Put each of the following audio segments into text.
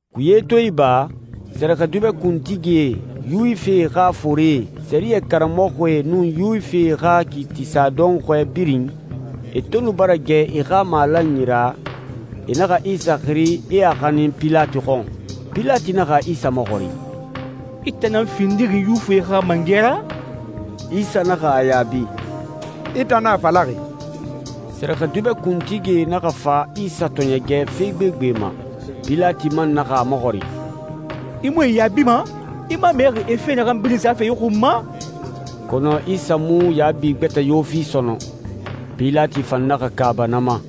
Kuye to iba, sɛrɛxɛdubɛ kuntigie, Yuwifie xa forie, sɛriyɛ karamɔxɔe, nun Yuwifie xa kiitisa dɔnxɔɛ birin, e to nu bara gɛ e xa malanyi ra, e naxa Isa xiri, e a xanin Pilati xɔn. Pilati naxa Isa maxɔrin, «I tan nan findixi Yuwifie xa mangɛ ra?» Isa naxa a yaabi, «I tan nan a falaxi.» Sɛrɛxɛdubɛ kuntigie naxa fa Isa tɔɔɲɛgɛ fe gbegbe ma. Pilati man naxa a maxɔrin, «I mu e yaabima? I mu a mɛxi e fe naxan birin safe i xun ma?» Kɔnɔ Isa mu yaabi gbɛtɛ yo fi sɔnɔn. Pilati fan naxa kaaba na ma.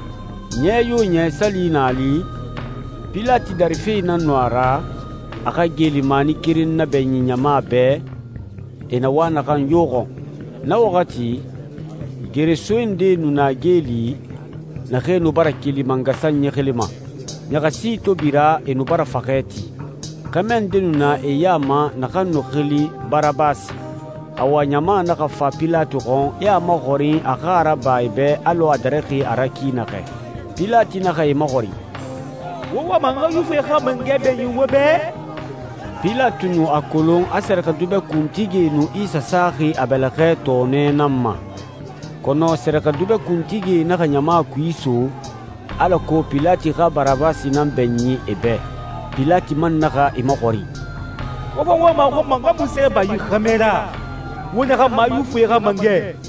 Ɲɛ yo ɲɛ, sali na a li, Pilati dari fe nan nu a ra, a xa geelimani keren nabɛɲin ɲama bɛ, e na wa naxan yo xɔn. Na waxati, geresoe ndee nu na geeli naxee nu bara keli mangasanyi xili ma. Ɲaxasi to bira, e nu bara faxɛ ti. Xɛmɛ nde nu na e ya ma naxan nu xili Barabasi. Awa ɲama naxa fa Pilati xɔn, e a maxɔrin, a xa a raba e bɛ, alɔ a darixi a ra ki naxɛ. Pilati naxa e maxɔrin, «Wo wama n xa Yuwifie xa mangɛ bɛɲin wo bɛ?» Pilati nu a kolon a sɛrɛxɛdubɛ kuntigie nu Isa saxi a bɛlɛxɛ tɔɔnɛ nan ma. Kɔnɔ sɛrɛxɛdubɛ kuntigie naxa ɲama kui iso, alako Pilati xa Barabasi nan bɛɲin e bɛ. Pilati man naxa e maxɔrin, «Wo fa wama a xɔn ma n xa munse raba yi xɛmɛ ra, wo naxan ma, a Yuwifie xa mangɛ?»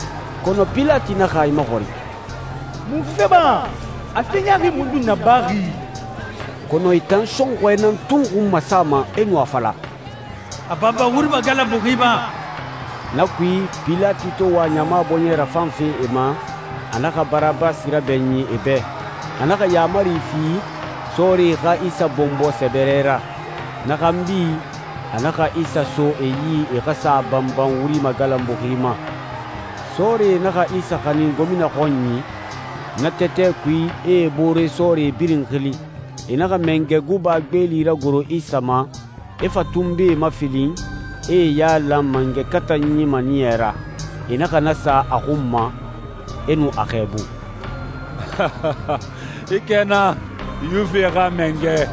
Kɔnɔ Pilati naxa e maxɔrin, «Munfe ma? A fe ɲaaxi mundun nabaxi?» Kɔnɔ e tan sɔnxɔɛ nan tun xun masama, e nu a fala, «A banban wuri magalanbuxi ma!» Na kui, Pilati to wa ɲama bɔɲɛ rafanfe e ma, a naxa Barabasi rabɛɲin e bɛ. A naxa yaamari fi sɔɔrie xa Isa bɔnbɔ sɛbɛrɛ ra. Na xanbi, a naxa Isa so e yi e xa sa a banban wuri magalanbuxi ma. Sɔɔrie naxa Isa xanin gomina xɔnyi, na tɛtɛ kui, e e boore sɔɔrie birin xili. E naxa mangɛ guba gbeeli ragoro Isa ma, e fa tunbee mafilin, e e yailan mangɛ katanyi maniyɛ ra. E naxa na sa a xun ma, e nu a xɛɛbu, «I kɛna, Yuwifie xa mangɛ.»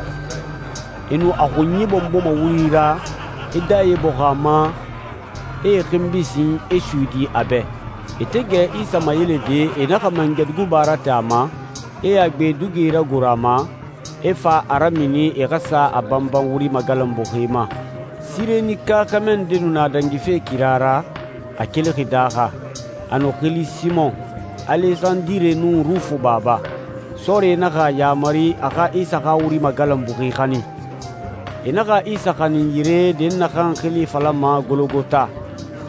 E nu a xunyi bɔnbɔma wuri ra, e dɛye bɔxun a ma, e e xinbi sin, e suyidi a bɛ. E to gɛ Isa mayelede, e naxa mangɛ guba rate a ma, e a gbe dugi ragoro a ma, e fa a ramini e xa sa a banban wuri magalanbuxi ma. Sirenika xɛmɛ nde nu na dangife kira ra, a kelixi daaxa. A nu xili Simɔn, Alesandire nun Rufu baba. Sɔɔrie naxa a yamari, a xa Isa xa wuri magalanbuxi xanin. E naxa Isa xanin yire dɛnnaxan xili falama Gologota,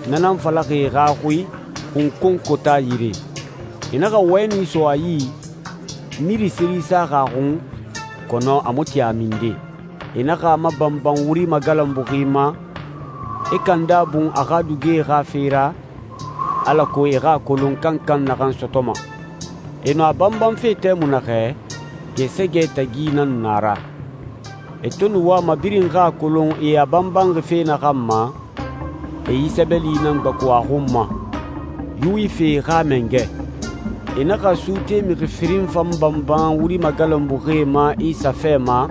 na nan falaxi e xa xui, «xunkonkota yire». E naxa wɛni so a yi, miri seri saxi a xun, kɔnɔ a mu tin a minde. E naxa a mabanban wuri magalanbuxi ma, e kanda bun a xa dugie xa fe ra, alako e xa a kolon kankan naxan sɔtɔma. E nu a banbanfe tɛmui naxɛ, gɛɛsɛgɛ tagi nan nu a ra. E to nu wama birin xa a kolon e a banbanxi fe naxan ma, e yi sɛbɛli nan gbaku a xun ma, «Yuwifie xa mangɛ.» E naxa suute mixi firin fan banban wuri magalanbuxie ma Isa fɛ ma,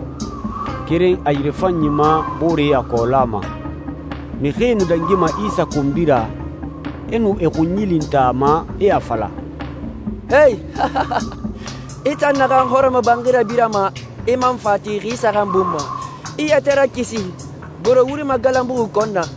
keren a yirefanyi ma, boore a kɔɔla ma. Mixie nu dangima Isa konbi ra, e nu e xunyi lintan a ma, e a fala, «Ee, i tan naxan hɔrɔmɔbanxi rabirama, i man fa a ti xi saxan bun ma, i yɛtɛ rakisi! Goro wuri magalanbuxi kɔn na!»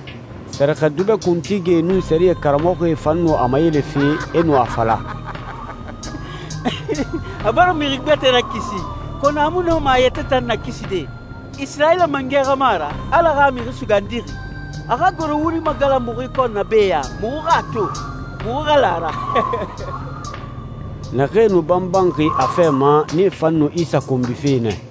Sɛrɛxɛdubɛ kuntigie nun sɛriyɛ karamɔxɔe fan nu a mayelefe, e nu a fala, «A bara mixi gbɛtɛe rakisi, kɔnɔ a mu nɔma a yɛtɛ tan nakiside. Isirayila mangɛ xa mu a ra, Ala xa Mixi Sugandixi? A xa goro wuri magalanbuxi kɔn be ya, muxu xa a to, muxu xa la a ra.» Naxee nu banbanxi a fɛ ma, nee fan nu Isa konbife nɛ.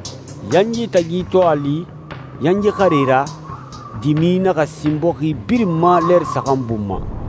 Yanyi tagi to a li, yanyi xare ra, dimi naxa sin bɔxi birin ma lɛɛri saxan bun ma.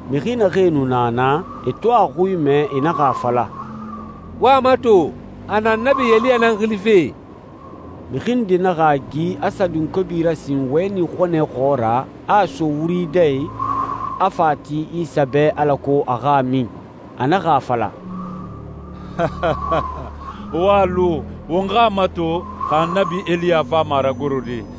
Mixi naxee nu na naa, e to a xui mɛ, e naxa a fala, «Wo a mato, a na Annabi Eliya nan xilife!» Mixi nde naxa a gi, a sa dunkobi rasin wɛni xɔnɛ xɔɔra, a a so wuri dɛ i, a fa a ti Isa bɛ alako a xa a min. A naxa a fala, «Wo a lu, won xa a mato xa Annabi Eliya fama a ragorode.»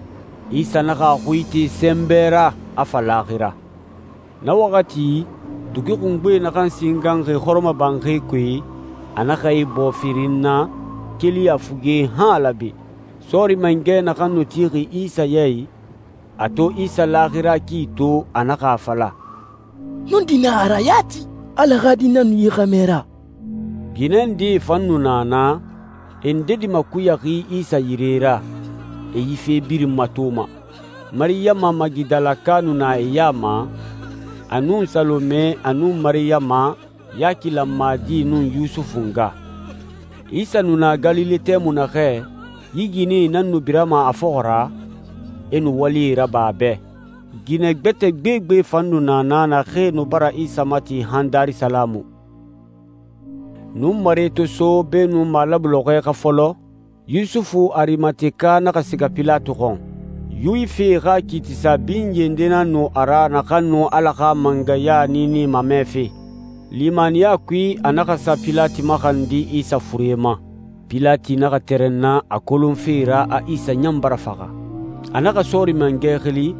Isa naxa a xui ite sɛnbɛ ra, a fa laaxira. Na waxati, dugi xungbe naxan singanxi hɔrɔmɔbanxi kui, a naxa ibɔɔ firin na, keli a fuge han a laabe. Sɔɔri mangɛ naxan nu tixi Isa ya i, a to Isa laaxira ki to, a naxa a fala, «Nɔndi nan a ra yati, Ala xa Di nan nu yi xɛmɛ ra!» Ginɛ ndee fan nu na naa, e ndedi makuyaxi Isa yire ra, e yi fe birin matoma. Mariyama Magidalaka nu na e ya ma, a nun Salome, a nun Mariyama, Yaki lanmadi nun Yusufu nga. Isa nu na Galile tɛmui naxɛ, yi ginɛe nan nu birama a fɔxɔ ra, e nu walie raba a bɛ. Ginɛ gbɛtɛ gbegbe fan nu na naa naxee nu bara Isa mati han Darisalamu. Nunmare to so, beenun malabu lɔxɔɛ xa fɔlɔ, Yusufu Arimateka naxa siga Pilati xɔn. Yuwifie xa kiitisa binye nde nan nu a ra naxan nu Ala xa mangɛya niini mamɛfe. Limaniya kui, a naxa sa Pilati maxandi Isa fure ma. Pilati naxa tɛrɛnna a kolonfe ra a Isa ɲan bara faxa. A naxa sɔɔri mangɛ xili,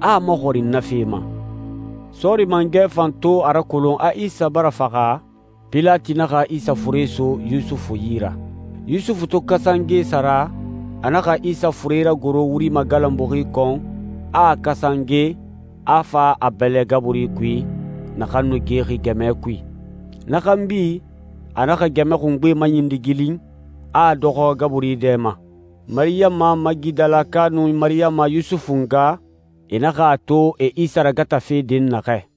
a a maxɔrin na fe ma. Sɔɔri mangɛ fan to a rakolon a Isa bara faxa, Pilati naxa Isa fure so Yusufu yi ra. Yusufu to kasange sara, a naxa Isa fure ragoro wuri magalanbuxi kɔn, a a kasange, a fa a bɛlɛ gaburi kui, naxan nu gexi gɛmɛ kui. Na xanbi, a naxa gɛmɛ xungbe maɲindigilin, a a dɔxɔ gaburi dɛ ma. Mariyama Magidalaka nun Mariyama Yusufu nga, e naxa a to e Isa ragatafe dɛnnaxɛ.